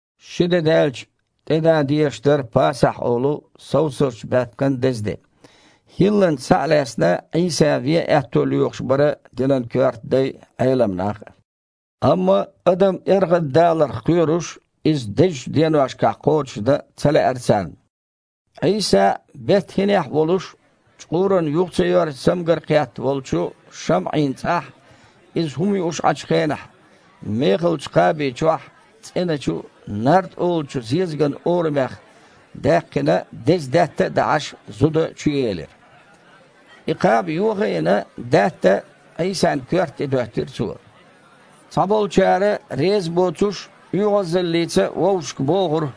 Ши де даьлча тІедан дезаш дара « Пасахь» олу совсазчу баьпкан деза де. ХІилланца схьа а лаьцна, Іийса вен аьтто лоьхуш бара динан коьрта дай а, Іелам нах а. Амма адам эргІаддаларх кхоьруш, иза дезачу деношкахь кхочушдан ца лаьара царна. Іийса Бет-ХІинехь волуш, чкъуран юха ца йоьрзу цамгар кхетта волчу ШамІин цІахь Иза хІума юуш Іачу хенахь, мехалчу кхаби чохь, цІеначу, нард олучу зезаган орамех даьккхина деза даьтта а дахьаш, зуда чуелира. И кхаба, йоха а йина, даьтта Іийсан коьрта тІе доьттира цо. Цхьаболчара, резабоцуш, оьгІазаллица вовшашка бохура: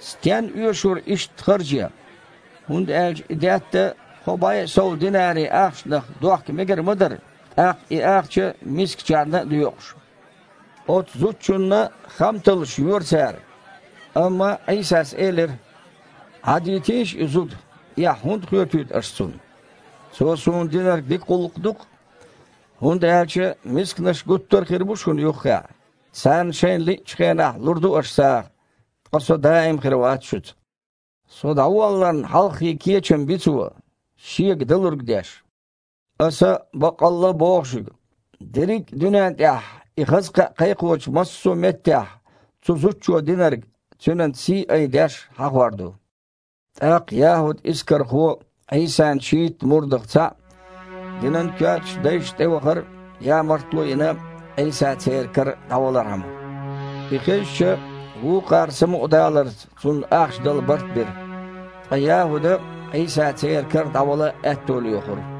«Стенна оьшура иштта харж ян? ХІунда аьлча и даьтта кхо бІе а сов динари ахчанах дохка мегар ма дара, тІаккха и ахча мискачарна а доькъуш». Оцу зудчунна хамталлаш йора цара. Амма Іийсас элира: «Іадйитийша и зуда, эхь хІунда хоьтуьйту аш цунна? Цо Суна динарг дика гІуллакх ду-кх. ХІунда аьлча мисканаш гуттар а хир бу шуна юххехь, царна шайна лиъначу хенахь лур ду аш сагІа, ткъа Со даим хир вац шуьца. Со дІаволларна хьалххе кечам би цо, шега далург деш. Аса баккъалла а боху шуьга: дерриг а дуьнен тІехь, и хаза кхаъ кхайкхочу массо а меттехь, цу зудчо динарг, цуьнан сий айдеш, хьахор ду». ТІаккха ЯхІуд Искархо, Іийсан шийтта мурдах цхьаъ, динан коьртачу дайшна тІевахара, ямартло а йина, Іийса церан кара дІавалархьама. И хезча, вукхара самукъадаларца цунна ахча дала барт бира. Ткъа ЯхІуда Іийса церан кара дІавала аьтто лоьхура.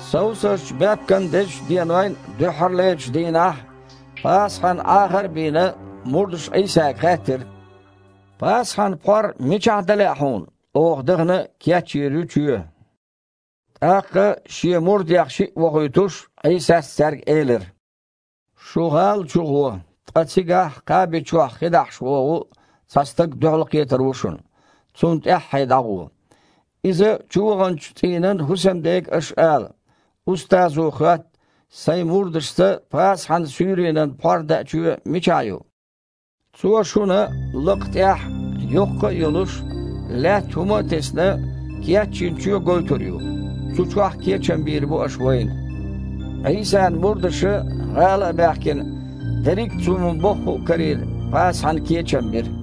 Совсазчу баьпкан дезачу денойн дуьххьарлерчу дийнахь, Пасахьан Іахар а бийна, мурдаша Іийсага хаьттира: «Пасахьан пхьор мичахь дан лаьа Хьуна? Оха, дахана, кечйийр ю чоь». ТІаккха, Шен мурдех шиъ вохуьйтуш, Іийсас цаьрга элира: «Шу гІала чу гІо, ткъа цигахь кхаби чохь хи дахьаш вогІу цхьа стаг дуьхьалкхетар ву шуна, цунна тІаьххье дІагІо. Иза чу ваханчу цІийнан хІусамдега аш ала: „Устазо хоьтту: Сайн мурдашца Пасахьан суьйренан пхьор даа чоь мичахь ю?“ Цо шуна лакха тІехь йоккха а йолуш, лаьтта хІума а тесна, кечйина чоь гойтур ю, цу чохь кечам бийр бу аш вайна». Іийсан мурдаша, гІала а баьхкина, дерриг а Цо ма-бохху а карийна, Пасахьана кечам бира.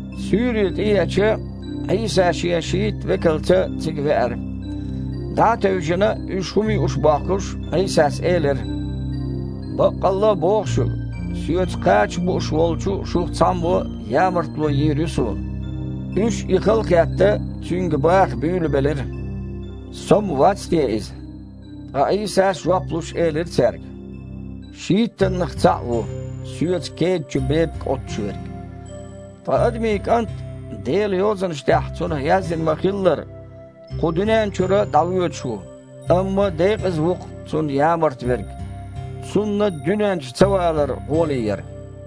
Суьйре тІееача, Іийса Шен шийтта векалца цига веара. ДІа а тевжина, уьш хІума юуш бохкуш, Іийсас элира: «Баккъалла а боху шуьга, Соьца кхача бууш волчу шух цхьаммо ямартло йийр ю Суна». Уьш, и халахетта, Цуьнга баха буьйлабелира: «Со-м вац те иза?» Ткъа Іийсас жоп луш, элира цаьрга: «Шийттаннах цхьаъ ву, Соьца кеда чу бепиг Іуттуш верг. Ткъа Адамийн КІант, Делан Йозанашна тІехь Цунах яздина ма-хиллара, кху дуьнен чуьра дІавоьдуш ву, амма декъаза ву-кх Цунна ямарта верг! Цунна дуьнен чу ца валар гІоле яра!»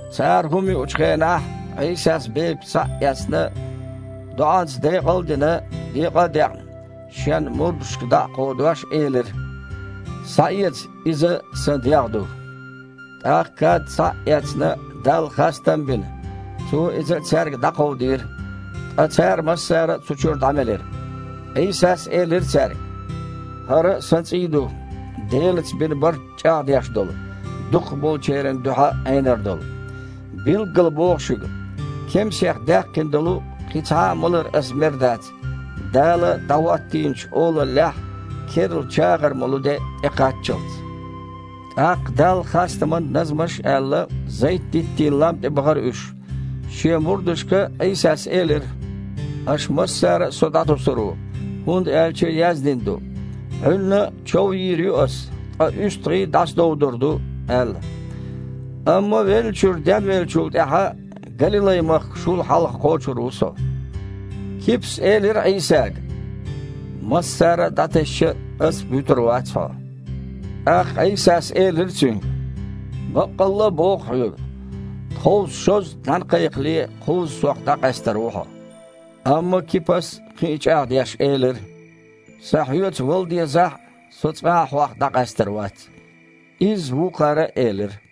Цара хІума юучу хенахь, Іийсас, бепиг схьа а эцна, доІанца декъал а дина, декъа а декъна, Шен мурдашка дІа а кховдош, элира: «Схьаэца – иза Сан дегІ ду». ТІаккха кад, схьа а эцна, Далла хастам а бина, Цо иза цаьрга дІакховдийра, ткъа цара массара а цу чуьра дІамелира. Іийсас элира цаьрга: «ХІара Сан цІий ду, Делаца бина барт чІагІдеш долу, дукхахболчеран дуьхьа Іенор долу. Билггала боху шуьга: кемсех даьккхина долу кхин цхьа а малар Аса мер дац, Дала дІахІоттийначу Олаллехь керла чагІар молу де тІекхаччалц». ТІаккха Далла хастаман назманаш а аьлла, Зайт-диттийн лам тІе бахара уьш. Шен мурдашка Іийсас элира: «Аша массара а Со дІатосур ву, хІунда аьлча яздина ду: „Іуьнна чов йийр ю Аса, ткъа уьстагІий дІасадовдур ду“, – аьлла». «Амма веллачуьра денвеллачул тІаьхьа Галилай-махка шул хьалха кхочур ву Со». Кипас элира Іийсага: «Массара дІатесча а, ас-м вуьтур вац Хьо». ТІаккха Іийсас элира цуьнга: «Баккъалла а боху хьоьга: тховса, шозза нІаьна кхайкхале, кхузза Сох дІакъаьстар ву хьо». Амма Кипас, кхин а чІагІдеш, элира: «Сан Хьоьца вала дезахь а, со цкъа а Хьох дІакъаьстар вац». Изза вукхара а элира.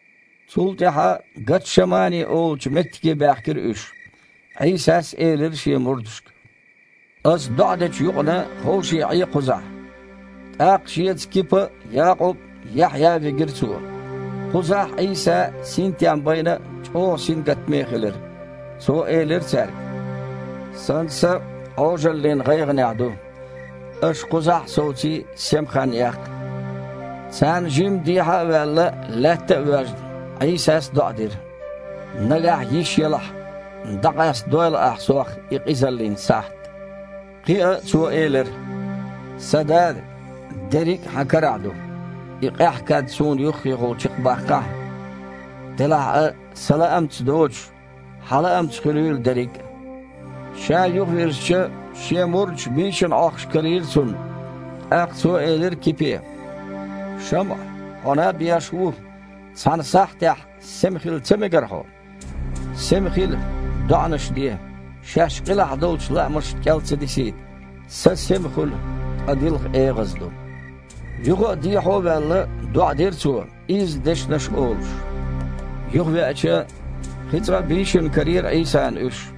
Цул тІаьхьа Гатшамани олучу меттиге баьхкира уьш. Іийсас элира Шен мурдашка: «Ас доІа дечу юкъана, ховший Іе кхузахь». ТІаккха Шеца Кипа а, Якъуб а, Яхьъя а вигира Цо. Кхузахь Іийса синтем байна а, чІогІа сингаттаме а хилира. Цо элира цаьрга: «Сан са Іожаллин гІайгІанехь ду. Аша кхузахь а совций, сема хан яккха». Царна жимма дехьа а ваьлла, лаьтта а воьжна, Іийсас доІа дира: «Нагахь йиш елахь, дІакъастадойла Ахь Сох и къизаллин сахьт», – кхин а Цо элира: «Сан Дада! Дерриг а Хьан карахь ду, и къаьхьа кад Суна юххехула чекхбаккхахьа! Делахь а, Сан лаамца доцуш, Хьан лаамца хуьлийла дерриг а». Ша юхавирзича, Шен мурдаш бийшина Іохкуш карийра Цунна. ТІаккха Цо элира Кипе: «ШамІа, хьо наб еш ву? Цхьана сахьтехь сема хила ца мегара хьо? Сема хила, доІанаш де, шаьш къилахь долчу лаамашна кІел ца дисийта. Са сема хуьлу, ткъа дилха эгІаза ду». Юха а дехьо ваьлла, доІа дира Цо, изза дешнаш олуш. Юхавеача, кхин цкъа а бийшина карийра Іийсана уьш,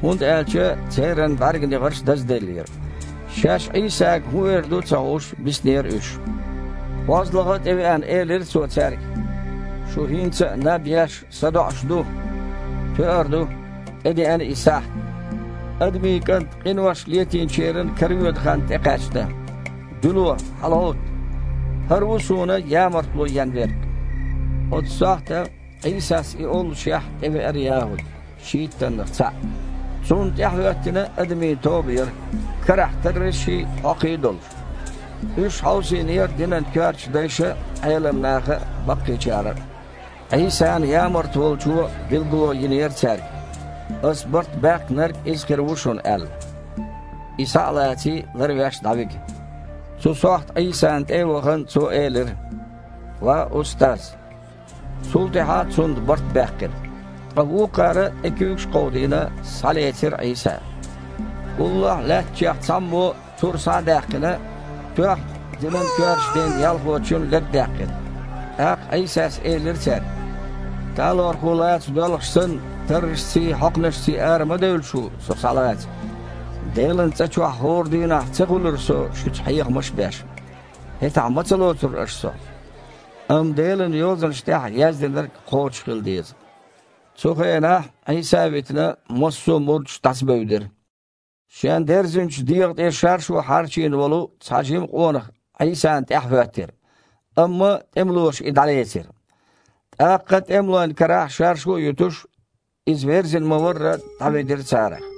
хІунда аьлча церан бІаьрганегІарш дазделлера. Шаьш Іийсага хІун эр ду а ца хууш биснера уьш. КхозлагІа а тІевеана, элира Цо цаьрга: «Шу хІинца а наб еш, садоІуш ду? Тоьар ду, тІедеана и сахьт. Адамийн КІант къинош летийначеран каравоьду хан тІекхаьчна. Дуьйло, хьалагІовтта! ХІара ву Суна ямартло ен верг». Оцу сохьта, Іийсас и оллушехь, тІевеара ЯхІуд, шийттаннах цхьаъ. Цунна тІаьхьахІоьттина адамийн тоба яра, карахь таррашший, хьокхий а долуш. Уьш хьовсийнера динан коьртачу дайша а, Іелам наха а, баккхийчара а. Іийсана ямарта волчо билгало йинера цаьрга: «Ас барт баьккхинарг Иза хир ву шуна, – аьлла, – И, схьа а лаций, ларвеш дІавига». Цу сохьта Іийсана тІе а вахана, цо элира: «Ва устаз!» Цул тІаьхьа Цунна барт баьккхира. Ткъа вукхара, тІе куьйгаш а кховдийна, схьалецира Іийса. Уллохь лаьттачех цхьаммо, тур схьа а даьккхина, тоьхна, динан коьртачу ден ялхочун лерг даьккхира. ТІаккха Іийсас элира цаьрга: «Талорхо лаца доьлхуш санна, таррашций, хьокханашций ара ма девлла шу Со схьалаца? Делан цІа чохь хІора дийнахь ца хуьлура Со шуьца, хьехамаш а беш? ХІетахь ма ца лоцура аш Со? Амма Делан Йозанаш тІехь яздинарг кхочушхила деза». Цу хенахь, Іийса а витина, массо а мурдаш дІасабевдира. Шен дерзинчу дегІа тІе шаршу хьарчийна волу цхьа жима къонах Іийсана тІаьхьа хІоьттира. Амма тІемалоша и дІалецира. ТІаккха тІемалойн карахь шаршу а юьтуш, иза верзина ма-варра дІаведира царах.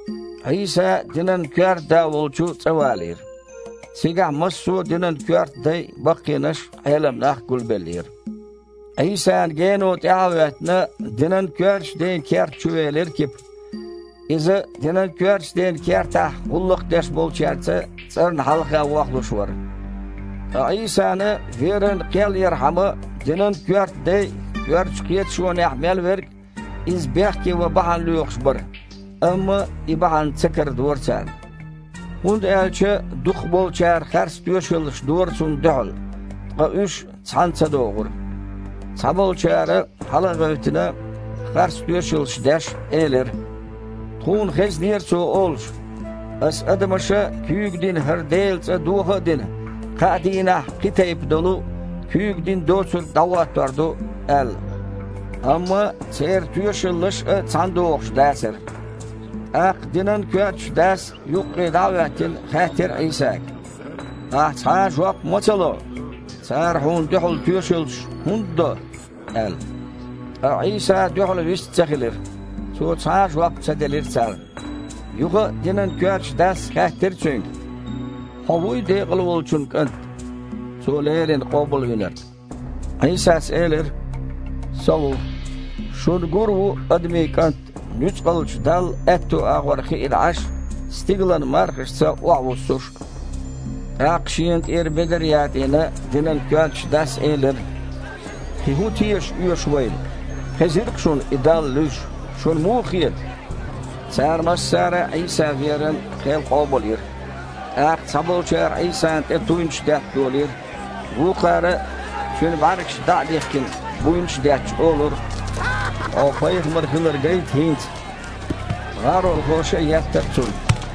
Іийса динан коьрта да волчу цІа валийра. Цигахь массо а динан коьрта дай а, баккхийнаш а, Іелам нах а гулбеллера. Іийсана гено тІаьхьа а хІоьттина, динан коьртачу ден керта чу велира Кипа. Иза динан коьртачу ден кертахь гІуллакх деш болчаьрца цІарна хьалха вохлуш вара. Ткъа Іийсана веран кхел ярхьама, динан коьрта дай а, коьртачу кхеташонехь мел верг а Иза бехке ван бахьана лоьхуш бара, амма и бахьана ца карадора царна. ХІунда аьлча дукхахболчара харц тоьшаллаш дора Цунна дуьхьал, ткъа уьш цхьана ца догІура. Цхьаболчара, хьала а гІевттина, харц тоьшаллаш деш, элира: «Тхуна хезнера Цо олуш: „Аса адамаша куьйга дина хІара Делан цІа доха а дина, кхаа дийнахь кхин тайпа долу, куьйга дина доцург дІахІоттор ду“, – аьлла». Амма церан тоьшаллаш а цхьаьнадогІуш дацара. ТІаккха динан коьртачу дас, юккъе дІа а хІоьттина, хаьттира Іийсага: «Ахь цхьа а жоп ма ца ло? Цара Хьуна дуьхьал тоьшаллаш хІунда до?» – аьлла. Ткъа Іийса дуьхьал вист а ца хилира, Цо цхьа а жоп ца делира царна. Юха а динан коьртачу дас хаьттира Цуьнга: «Хьо вуй Декъалволчун КІант? Цо леррина Къобалвинарг?» Іийсас элира: «Со ву. Шуна гур а ву Адамийн КІант Нуьцкъалчу Далла аьтто агІор хиъна Іаш а, стигалан мархашца охьавуссуш а». ТІаккха, шена тІера бедар а ятІийна, динан коьртачу дас элира: «Кхин хІун тешаш оьшу вайна? Хезира-кх шуна И Далла луьйш, шуна муха хета?» Цара массара а Іийса веран кхел къобалйира. ТІаккха цхьаболчара Іийсана тІе туйнаш детта долийра, вукхара, Цуьнан бІаьргаш дІа а дихкина, буйнаш а детташ, олура: «Хьо пайхамар хилар гайта хІинца!» ГІаролхоша а еттара Цунна.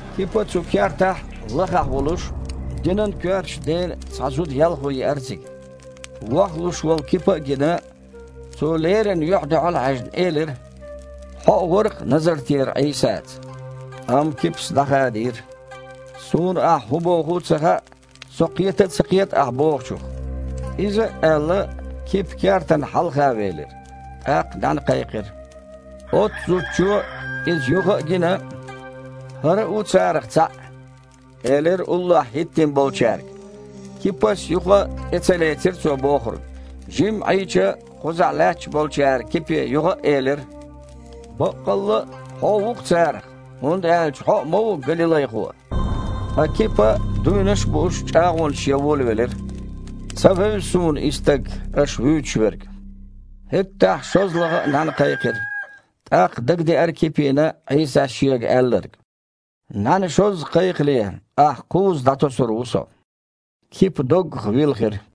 Кипа цу кертахь, лахахь волуш, динан коьртачу ден цхьа зуда-ялхо еара цига. Вохлуш волу Кипа а гина, цо, леррина юьхь-дуьхьал а хьаьжна, элира: «Хьо а вара-кх Назартера Іийсаца». Амма Кипас дІахадийра: «Суна ахь хІун боху а ца хаьа, со кхета а ца кхета ахь бохучух». Иза а аьлла, Кипа кертан хьалха велира. ТІаккха нІаьна кхайкхира. Оццу зудчо, иза юха а гина, «ХІара а ву царах цхьаъ», – элира уллохь хІиттина болчаьрга. Кипас юха а тІе ца лецира цо бохург. Жимма Іийча, кхузахь лаьтташ болчара Кипе юха а элира: «Баккъалла а хьо ву-кх царах, хІунда аьлча хьо а ма-ву галилайхо». Ткъа Кипа, дуйнаш а бууш, чІагІонаш ян волавелира: «Ца вевза суна И стаг, аш вуьйцуш верг». ХІеттахь шозлагІа а нІаьна кхайкхира. ТІаккха дагадеара Кипина Іийсас шега аьлларг: «НІаьна шозза кхайкхале, ахь кхузза дІатосур ву Со». Кипа доггах вилхира.